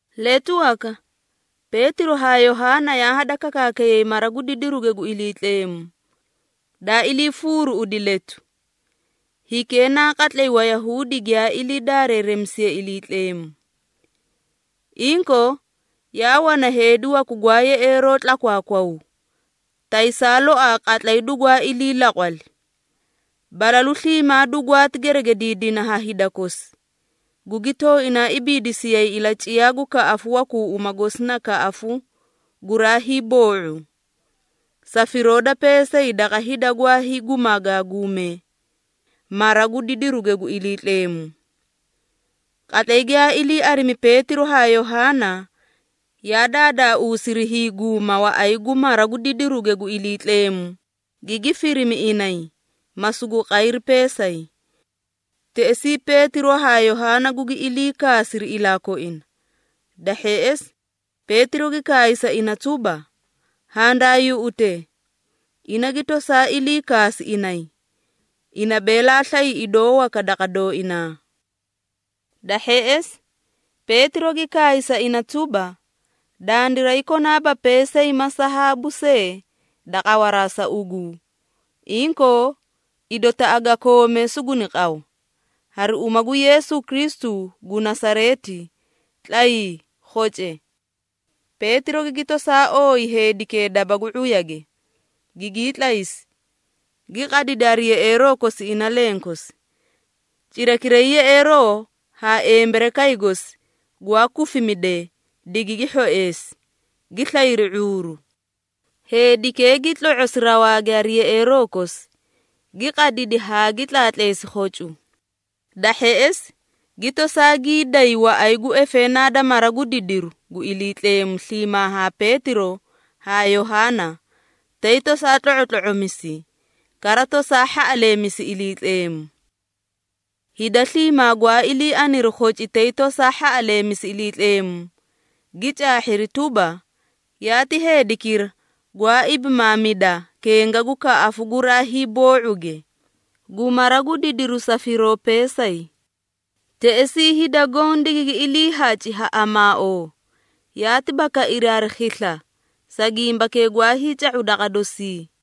Letu waka Peetiro haa Yohaana yaa hadakakaakayay mara gu didiruge gu Iliitleemu, daa iliifuuruuꞌudi letu, hikee na qatlay Wayahuudi giyaa ilii daareeremisiyee Iliitleemu. Inkoo, yaa wana heedi waku gwaa yeꞌeeroo tlakwaakwaw taysaa loaa qatlay dugwaa ilii laqwali. Balalu sliimaa dugwaati geregediidina ha hida kosi, gugi tooinaa ibiidisiyay ilaciyaa gu kaꞌafu wakuu uma gosi na “Kaꞌafu guraa hiiboo⁄u,” sa firoo da peesay daqa hida gwaa hiigumagaaguumee mara gu didiruge gu Iliitleemu. Qatlay giyaa ilii arimi Peetiro haa Yohaana yaa daadaauusiri hiiguuma waꞌay gu mara gu didiruge gu Iliitleemu, gigi firimi inay, ma sugu qayri peesay. Teꞌesii Peetiro haa Yohaana gugi ilii kaasiri ilaa koina. Da hheꞌesi Peetiro gi kaay sa ina tuba, “Handaa yuꞌute!” Ina gi tosaa ilii kaasi inay, ina beela slay idoo waka daqa dooinaa. Da hheꞌesi Peetiro gi kaay sa ina tuba, “Dandiray konaaba peesay ma sahaabu see da qawaraa sa ugu, inkoo, idotaꞌa ga koomee suguni qaw. Hari uma gu Yeesu Kristu gu Nasareeti, tlayii, khoce!” Peetiro gigi tosaa ooyi heedikee daba gu ⁄uyage, gigii tlaysi, gi qadidi hari yeꞌeeroo kosi ina lenkosi. Cirakiray yeꞌeeroo haa emberekay gosi gwaa kufimidee, digigi hhoeesi, gi slayri ⁄uuru. Heedikee gi tlo⁄osi rawaage hari yeꞌeeroo kosi, gi qadidi haa gi tlaatleesi khocu. Da hheꞌesi, gi tosaa gii day waꞌay gu efeenaa da mara gu didiruge gu Iliitleemu sliimaa haa Peetiro haa Yohaana tay tosaa tlo⁄otlo⁄omisi, kara tosaa hhaꞌaleemisi Iliitleemu. Hida sliimaa gwaa ilii aniri khoci tay tosaa hhaꞌaleemisi Iliitleemu, gi caahhiri tuba, yaati heedikira gwaa ibimaamida kenga gu “kaꞌafu guraa hiiboo⁄uge” gu mara gu didiru sa firoo peesay. Teꞌesii hida goõ digigi iliihaci ha amaaoo, yaati bakairi hari khisla, sa gimbakee gwaa hiica⁄u daqa dosii.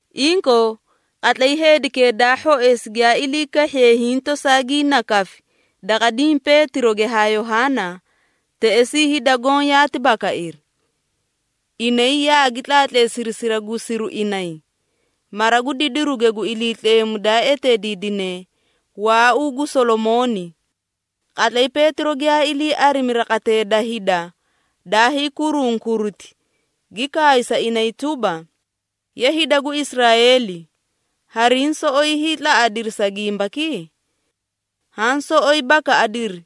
Inkoo qatlay heedikee daa hhoeesi giyaa ilii kahhiye hiĩ tosaa gii nakafi daqa diĩ Peetiroge haa Yohaana, teꞌesii hida goõ yaati bakairi. Inay yaagi tlaatleesiri siragusiru inay, mara gu didiruge gu Iliitleemu daa eteediidine “Waauu gu Solomooni.” Qatlay Peetiro giyaa ilii arimi raqatee da hida daa hiikurunkuriti, gi kaay sa inay tuba, “Ye hida gu Israeeli, hariĩ soꞌoyi hiitlaꞌadiri sa gimbaki? Haã soꞌoyi bakaꞌadiri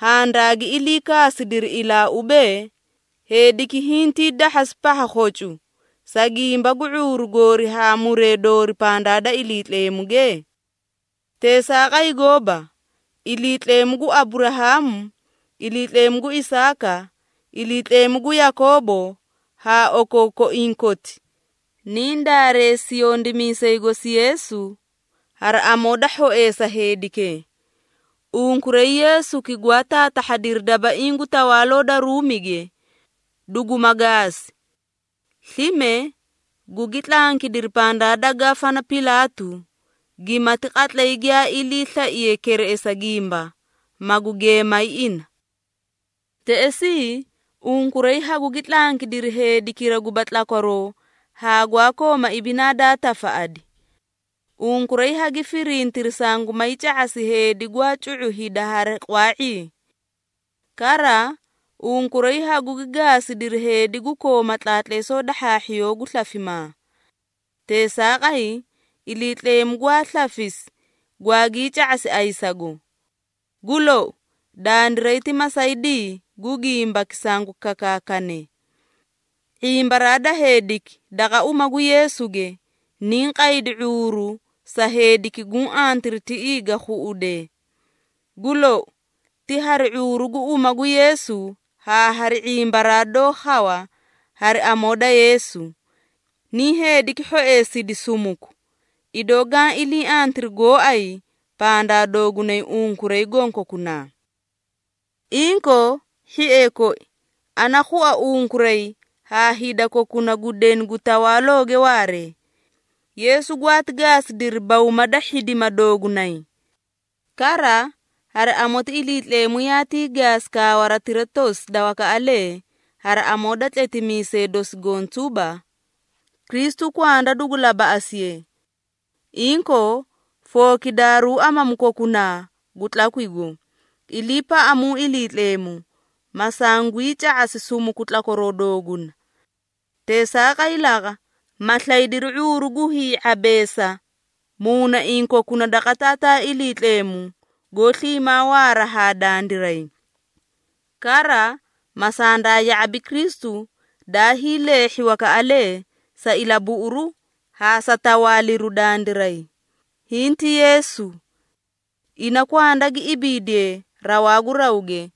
handaagi ilii kaasidiri ilaa ubee, heediki hintii dahhasi pahha khocu, sa gimba gu ⁄uuru goori haa muree doori pandaa da Iliitleemuge? Teesaaqay gooba! Iliitleemu gu Aburahaamu, Iliitleemu gu Isaaka, Iliitleemu gu Yakoobo haa okookoiĩ koti, niĩ daareesi yondimiisay gosi Yeesu, hari amoo da hhoeesa heedikee. Unkuray Yeesuki gwaa taatahhadiri dabaiĩ gu tawaaloo da Ruumige, duguma gaasi. Slime, gugi tlankidiri pandaa da Gafana Pilaatu, gimati qatlay giyaa iliislaiye kereꞌesa gimba, magu geemay ina. Teꞌesii unkuray hagugi tlankidiri heedikira guba tlakwaroo haa gwaa kooma ibinaa daa tafaꞌadi. Unkuray hagi firintiri sangumay ca⁄asi heedi gwaa cu⁄u hida hari qwaa⁄ii. Kara, unkuray hagugi gaasidiri heedi gu kooma tlaatleesoo da hhaahhiyoo gu slafimaa. Teesaaqay, Iliitleemu gwaa slafisi gwaagii ca⁄asi ayisago. Gu lou, dandiray ti masaydii gu gimbaki sangu kakaakane. ⁄imbaraa da heediki daqa uma gu Yeesuge, niĩ qaydi ⁄uuru sa heediki guũ antiri tiꞌii ga khuꞌudee. Gu lou, ti hari ⁄uuru gu uma gu Yeesu haa hari ⁄imbaraa doó khawa hari amoo da Yeesu, niĩ heediki hhoeesidi sumuku, idoo gaã ilii antiri gooay pandaa doogunay unkuray gonkokunaa. Inkoo, hhiee koi, ana khua unkuray haa hida kokuna gu deni gu tawaalooge waaree, Yeesu gwaati gaasidiri bawma da hhidima doogunay. Kara, hari amoti Iliitleemu yaatii gaasi kaawaratira tosi da wakaꞌalee hari amoo da tletimiisee dosi goõ tuba, ‘Kristu kwanda dugu labaꞌasiye.’ Inkoo, fookidaaruu amamu kokunaa gu tlakwigo, iliipaꞌamu Iliitleemu, ma sanguyii ca⁄asi sukumu tlakwaroo dooguna. Teesaaqay laqa, ma slaydiri ⁄uuru gu hii⁄abeesa muunaiĩ kokuna daqa Taataa Iliitleemugo goó sliimaa waara haa dandiray. Kara ma sandaa ya⁄abi Kristu daa hiileehhi wakaꞌalee sa ilabuꞌuruu haa sa tawaaliru dandiray, hinti Yeesu. Ina kwanda gi ibiidiye rawaa gu rawge,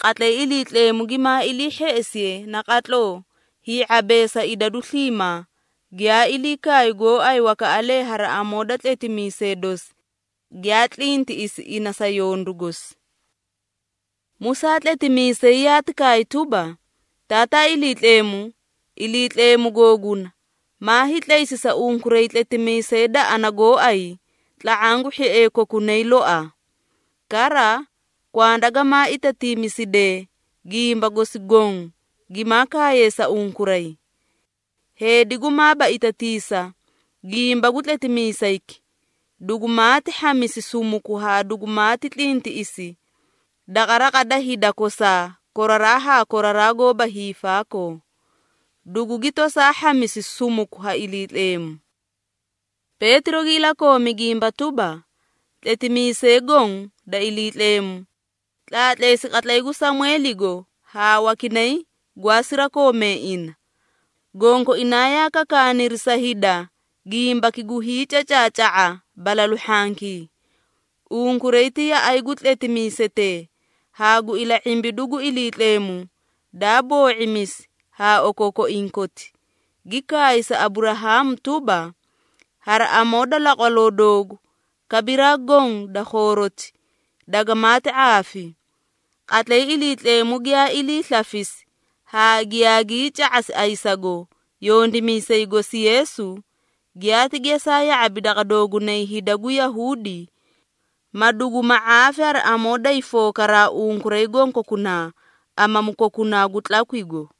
qatlay Iliitleemu gimaa ilii hheꞌesiye naqatloo hii⁄abeesa idadu sliimaa, giyaa ilii kaay gooay wakaꞌalee hari amoo da tletimiisee dosi giyaa tlintiꞌisi ina sa yondu gosi. Musaa tletimiisay yaati kaay tuba, ‘Taataa Iliitleemu, Iliitleemu googuna maa hiitlaysi sa unkuray tletimiisay da ana gooay tla⁄aã gu hhiee kokunaa loaa. Kara, kwanda gamaa itatiimisidee gimba gosi goõ gimaa kaaye sa unkuray. Heedi gumaaba itatiisa gimba gu tletimiisayki, dugumaati hhamisi sumuku haa dugumaati tlintiꞌisi daqa raqa da hida kosaa koraraa haa koraraa goóba hiifaakoo, dugugi toosaa hhamisi sumuku ha Iliitleemu.’ Peetiro gi ilakoomi gimba tuba, ‘Tletimiisee goõ da Iliitleemu, tlaatleesi qatlay gu Samweeligo haa wakinay gwaa sirakoomee ina, gonkoinaa yaa kakaaniri sa hida gimbaki gu hiicacaaca⁄a balalu hhankii.’ Unkuray ti yaꞌay gu tletimiisetee haa gu ila⁄imbidu gu Iliitleemu daa boo⁄imisi haa okookoiĩ koti, gi kaay sa Aburahaamu tuba, ‘Hari amoo da laqwaloo doogu, kabiraa goõ da khooroti, dagamaati ⁄aafi.’ Qatlay Iliitleemu giyaa ilii slafisi haa giyaagii ca⁄asi ayisago yondimiisay gosi Yeesu, giyaati geesaa ya⁄abi daqa doogunay hida gu Yahuudi, ma danguma ⁄aafi hari amoo day fookaraa unkuray gonkokunaa amamu kokunaa gu tlakwigo.”